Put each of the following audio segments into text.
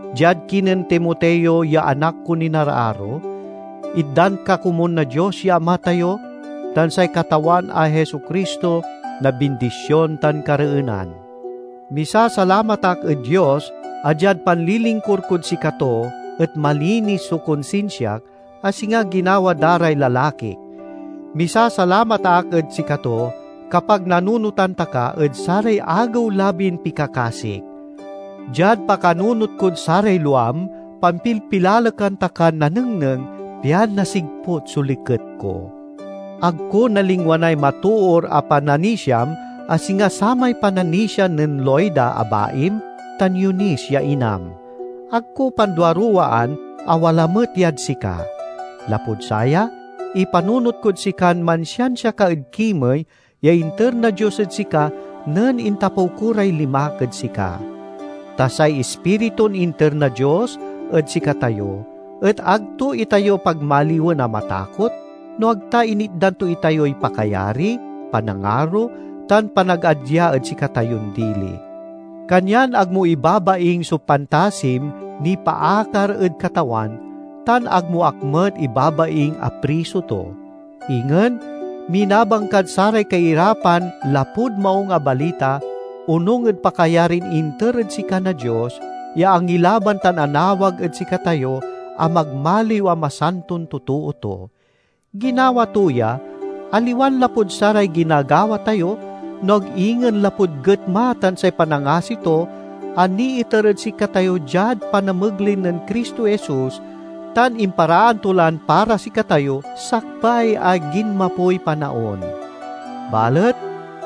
Diad kinen Timoteo ya anak kon inararo: Itdan ka komun na Dios ya Ama tayo tan say Katawan a Jesu-Cristo na bindision tan kareenan. Misasalamat ak ed Dios a diad panlilingkur kod sikato et malinis so konsinsiak, a singa ginawa da ray lalakik. Misasalamat ak ed sikato kapag nanunotan ta ka ed saray agew-labin pikakasik. Diad pakanunot kod saray luam, pampilpilalekan ta kan nanengneng pian nasigput so liket ko. Ag ko nalingwanay matoor a pananisiam, a singa samay pananisia nen Loida a baim tan Eunice ya inam. Ag ko panduaruwaan a wala met yad sika. Lapud saya, ipanunot kod sikan mansiansia ka ed kimey ya inter na Dios ed sika nen intapew ko ray limak ed sika. Ta say Ispiritun inter na Dios ed sikatayo et ag to itayo pagmaliwen a matakot, no ag ta initdan to itayoy pakayari, panangaro, tan panagadya ed sikatayon dili. Kanyan ag mo ibabaing so pantasim nipaakar ed Katawan, tan ag mo ak met ibabaing a priso to. Ingen, minabang kad saray kairapan lapud Maung a Balita, onung ed pakayarin inter ed sika na Dios ya angilaban tan anawag ed sikatayo a magmaliw a masanton totoo to. Ginawa to ya, aliwan lapud saray ginagawa tayo, no ag ingen lapud getma tan say panangasi to a niiter ed sikatayo diad panamegley nen Cristo Jesus, tan imparaan to lan para sikatayo sakbay a ginmapoy panaon. Balet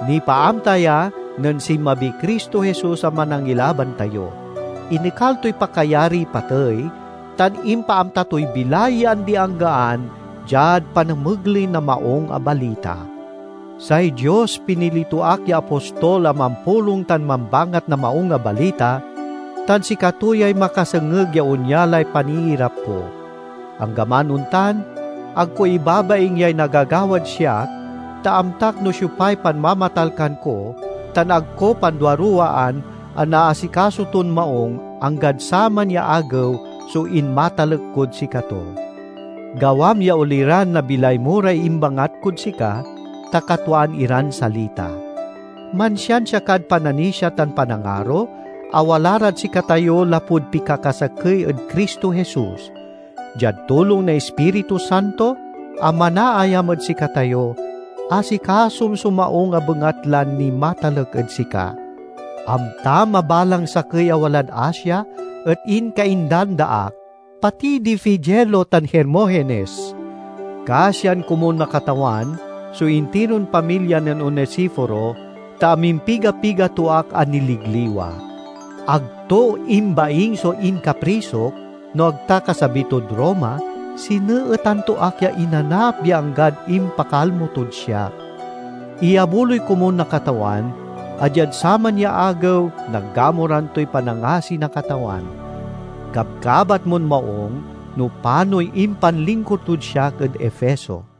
nipaamta ya nen sinmabiy Cristo Jesus a Manangilaban tayo. Inekal toy pakayariy patey, tan impaamta toy bilay ya andi-anggaan diad panamegley na Maung a Balita. Say Dios pinili to ak ya apostol a mampulong tan mambangat na Maung a Balita, tan sikato yay makasengeg ya onya lay paniirap ko. Anggaman ontan, ag ko ibabaing yay nagagawad siak ta amtak no siopay panmamatalkan ko tan ag ko panduaruwaan a naasikaso ton maung, anggad saman ya Agew, so inmatalek kod sikato. Gawam ya oliran na bilay mo ray imbangat kod sika, ta katwaan iran salita. Mansiansia kad pananisia tan panangaro, a wala rad sikatayo lapud pikakasakey ed Cristo Jesus. Diad tulong na Ispiritu Santo a manaayam ed sikatayo, asikasom so maung a bengatlan nimatalek ed sika. Amtam a balang sakey a walad Asia et inkaindan da ak, pati di Figelo tan Hermogenes. Kasian komun na Katawan so intiron pamilya nen Onesiforo, ta amimpiga-piga to ak a niligliwa. Ag to imbaing so inkaprisok, no ag ta kasabi tod Roma sineetan to ak ya inanap ya anggad impakalmo tod siak. Iyabuloy komun na Katawan a diad saman ya Agew, nagamuran toy panangasi na Katawan. Kabkabat mon maung no panoy impanlingkur tod siak ed Efeso.